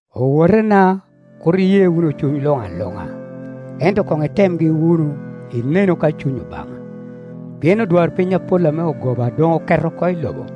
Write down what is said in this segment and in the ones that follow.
Owotena, kur iye wunu cuny luŋ aluŋa, ento koŋ itemgi wunu, inenu ka cuny Obaŋa, pien odwarpiny apol ame ogoba doŋ oket oko i lobo.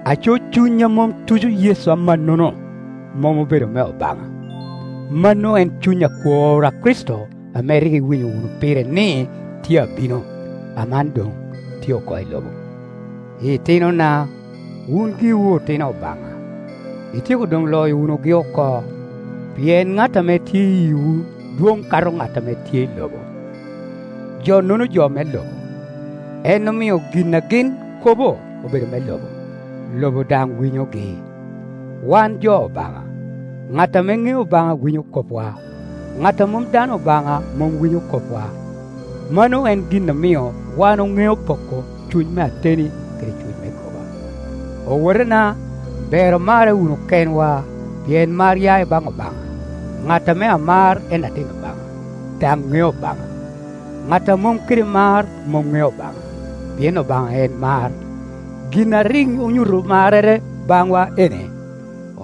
aco cuny a mom tuco Yecu amannono, mom obedo me Obaŋa. Mano en cuny akwor a Kricito ame rik iwinyo wunu pire, ni tye abino, aman doŋ tye oko i lobo. Itinona, wun giwu otino Obaŋa, ityeko doŋ loyo wunugi oko; pien ŋat ame tye i yiwu dwoŋ kato ŋat ame tye i lobo. Jo-nono jo me lobo, en omio gin a gin kobo obedo me lobo, lobo daŋ winyogi. Wan jo Obaŋa; ŋat ame ŋeo Obaŋa winyo kopwa, ŋat a mom dano Obaŋa mom winyo kopwa. Mano en gin a mio wan oŋeo poko cuny me ateni kede cuny me goba. Owotena, ber omarre wunu kenwa, pien mar ya i baŋ Obaŋa, ŋat ame amar en atin Obaŋa, daŋ ŋeo Obaŋa. Ŋat a mom kede mar mom ŋeo Obaŋa, pien Obaŋa en mar. Gin a rik onyuto marrere baŋwa ene,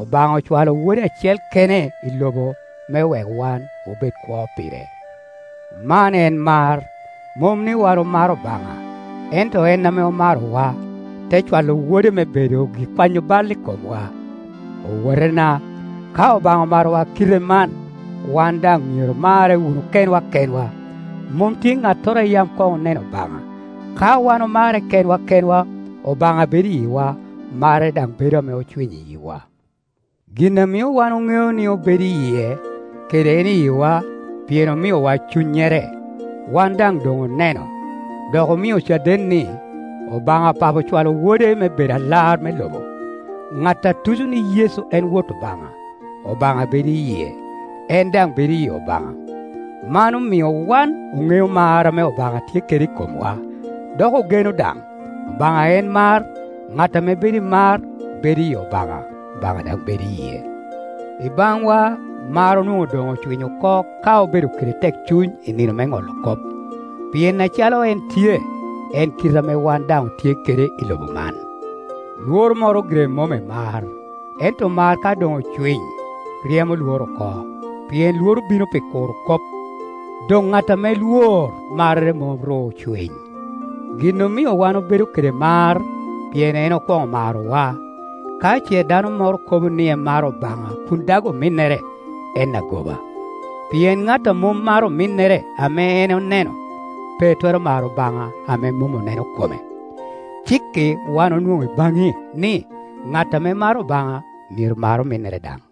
Obaŋa ocwalo Wode acel kene i lobo me wek wan obed kwo pire. Man en mar, mom ni wan omaro Obaŋa, ento en ame omarowa, te cwalo Wode me bedo gikwanyo bal i komwa. Owotena, ka Obaŋa omarowa kite man, wan daŋ myero omarre wunu kenwa kenwa. Mom tye ŋattoro a yam koŋ oneno Obaŋa; ka wan omarre kenwa kenwa, Obaŋa bedo i yiwa, marrere daŋ bedo ame ocwiny i yiwa. Gin a mio wan oŋeo ni obedo i yie, kede en i yiwa, pien omiowa Cunnyere. Wan daŋ doŋ oneno, dok omio caden ni, Obaŋa Papo ocwalo Wode me bedo Alar me lobo. Ŋat a tuco ni Yecu en Wot Obaŋa, Obaŋa bedo i yie, en daŋ bedo iyi Obaŋa. Man omio wan oŋeo mar ame Obaŋa tye kede i komwa, dok ogeno daŋ. Obaŋa en mar, Ŋat ame bedo i mar bedo iyi Obaŋa, Obaŋa daŋ bedo i yie. I baŋwa, mar onwoŋo doŋ ocwiny oko ka obedo kede tekcuny i nino me ŋolo kop, pien acalo en tye, en kite ame wan daŋ otye kede i lobo man. Lworo moro gire mom i mar, ento mar ka doŋ ocwiny, ryemo Iworo oko; pien Iworo bino pi kuro kop, doŋ ŋat ame Iwor marrere mom ru ocwiny. Gin omio wan obedo kede mar, pien en okwoŋo marowa. Ka ce dano moro kobo ni emaro Obaŋa kun dag ominnere, en agoba; pien ŋat a mom maro ominnere ame en oneno, pe twero maro Obaŋa ame mom oneno kome. Cik-ki wan onwoŋo i baŋe ni, ŋat ame maro Obaŋa myero mar ominnere daŋ.